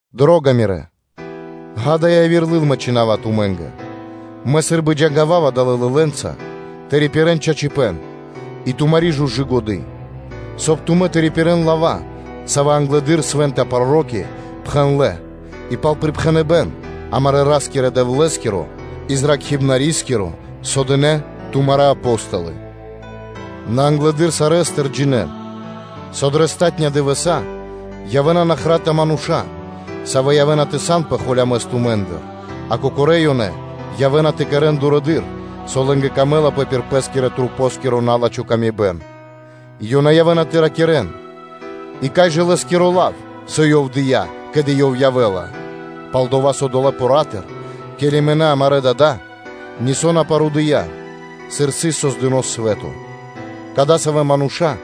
Дро́га мирэ́! Ѓа́да, яви́р лыл мэ чхина́ва тумэ́нгэ. Мэ сы́рбы джангавава далэ́ лылэнца тэ рипирэ́н чачипэ́н и тумари́ жужы годы́, соб (кай) тумэ́ тэ рипирэ́н лава́, савэ́ англэды́р свэ́нта проро́ки пхэндлэ́ и пал припхэныбэ́н амарэ́ Ра́скирэ – Дэвлэ́скиро и Зракхибнарискиро, со дынэ́ тумарэ́ Апо́столы. Нэ англэды́р сарэ́стыр джинэ́н, со дрэ палатунэ́ (последня) дывэса́ явэ́на нахрата мануша́, савэ́ явэ́на тэ санпэ холямэс тумэ́ндыр, а кокорэ́ ёнэ явэ́на тэ кэрэ́н дурэды́р, со лэ́нгэ пир годы́ пир налачхэ́-пэ́скирэ масэ́нгиро тырдыпэ́н, и ёнэ явэ́на тэ ракирэ́н: “И кай жа Лэ́скиро лав, со Ёв дыя́, ке́ли Ёв явэ́ла? Пал-дова́ со долэ́ поратыр, ке́ли мынэ́ амарэ́ дада́ нисо́ на парудыя, сыр сыс создыно́ свэ́то.” Кадасавэ́ мануша́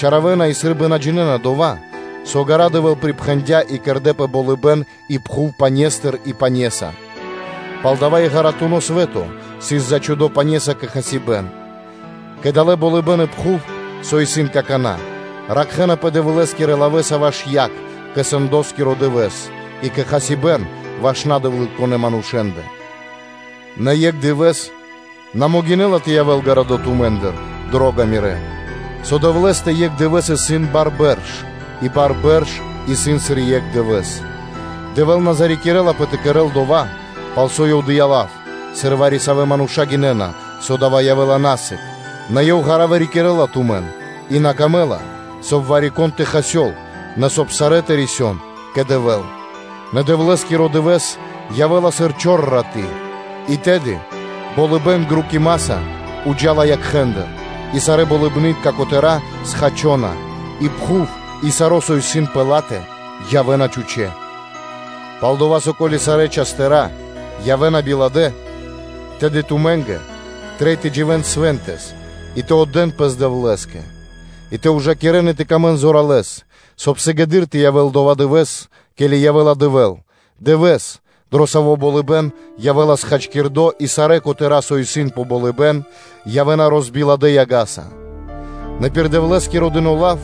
думинэна и сы́рбы на джинэ́на дова́, со ґара́ Дэвэ́л припхэндя́ и кэрдэ́пэ болыбэ́н и пхув пане́стыр и пане́са, палдава́ и ґаратуно свэ́то сыс зачхудо пане́са кэ хасибэ́н. Кэ дава́ болыбэ́н и пхув, со исын какана́, ракхэнапэ Дэвлэ́скирэ лавэ́са ваш яг кэ/жы́ко сэндоскиро дывэ́с и кэ хасибэ́н ваш надэвлытконэ манушэ́нгэ. Нэ екх дывэ́с на могинэ́ла тэ явэ́л гарадо́ тумэ́ндыр, дро́га мирэ́, со Дэвлэ́стэ екх дывэ́с исын сыр бар (тысёнцо) бэрш, и бар бэрш исын, сыр екх дывэ́с. Дэвэ́л на зарикирэлапэ тэ кэрэ́л дова́, пал со Ёв дыя́ лав, сыр вари-савэ́ мануша́ гинэ́на, со дава́ явэ́ла на сыг, нэ Ёв ґара́ вырикирэ́ла тумэн, и на камэ́ла, соб (кай) вари-кон тэ хасёл, нэ соб (кай) сарэ́ тэ рисён кэ Дэвэ́л. Нэ Дэвлэ́скиро дывэ́с явэ́ла сыр чор раты́, и тэды болыбэ́н грукимаса джа́ла криг якхэ́ндыр и сарэ́ болыбны́тка котэра́ схачона, и пхув и саро́, со исын пэ ла́тэ, явэ́на чхучэ́ (пуста). Пал-дова́ со ко́ли сарэ́ частыра (предметы) явэ́на биладэ, то тэды тумэ́нгэ трей тэ дживэ́н свэнтэс и тэ отдэ́н пэс Дэвлэ́скэ; и тэ ужакирэн и тэ тырдэнпэ зоралэ́с, соб (кай) сыгэды́р тэ явэ́л дова́ дывэ́с, ке́ли явэ́ла Дэвэ́л, дывэ́с, дро саво́ болыбэ́н явэ́ла схачкирдо и сарэ́ котэра́, со исын пэ болыбэ́н, явэ́на розбиладэ яга́са. Нэ пир Дэвлэ́скиро дыно́ лав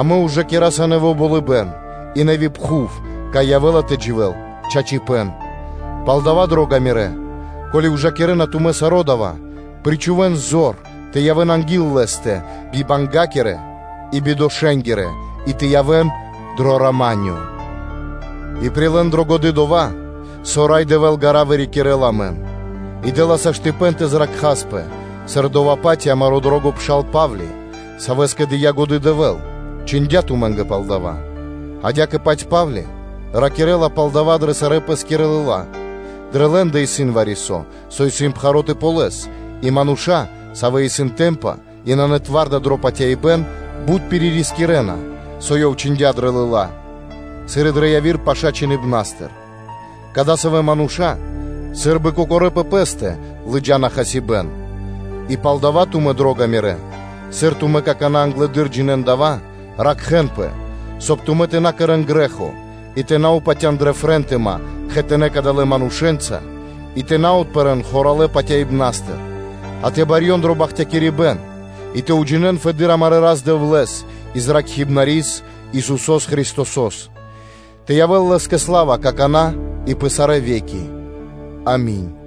амэ ужакираса нэво́ болыбэ́н и нэви́ пхув, кай явэ́ла тэ дживэ́л чачипэ́н. Зоралэ́ дро Ду́хо (Фа́но) Палдава́, дро́га мирэ́, ко́ли ужакирэ́на тумэ́ саро́ дава́, причхувэ́н зор тэ явэ́н анги́л Лэ́стэ бибангякирэ и бидошэнгирэ и тэ явэ́н дро рама́нё; и прилэ́н дрэ годы́ дова́, со Рай Дэвэ́л ґара́ вырикирэ́ла амэн и дэ́ла саштыпэн тэ зракхаспэ, сыр дова́-паць и амаро́ дро́го пшал Па́вли, савэ́скэ дыя́ годы́ Дэвэ́л, чхиндя́ тумэ́нгэ пал дава́, адя́кэ-паць Па́вли ракирэ́ла пал дава́ дрэ сарэ́ пэ́скирэ лыла́; дрэ лэ́ндэ исын вари-со, со исын пхаро́ тэ ґалёс, и мануша́, савэ́ исын тэмпа и нанэ зоралэ́ дро патяибэ́н, бут пиририскирэна, со ёв чхиндя́ дрэ лыла́, сыр и дрэ яви́р паша́ Чхиныбна́стыр. Кадасавэ́ мануша́ сы́рбы кокорэ́ пэ пэ́стэ лыджа́на хасибэ́н. И палдава́ тумэ́, дро́га мирэ́, сыр тумэ́ акана́ англэды́р джинэ́н дава́, ракхэ́нпэ, соб (кай) тумэ́ тэ на кэрэ́н грэ́хо и тэ на патя́н дрэ фрэнтыма кхэтанэ́ кадалэ́ манушэ́нца и тэ на отпэрэн хоралэ патяибнастыр а тэ барьён дро бахтякирибэ́н и тэ уджинэ́н фэды́р амарэ́ Рас-Дэвлэ́с, и Зракхибнарис (Спасителёс) Исусо́с Христосо́с. Тэ явэ́л Лэ́скэ сла́ва какана́ и пэ сарэ́ ве́ки. Ами́нь.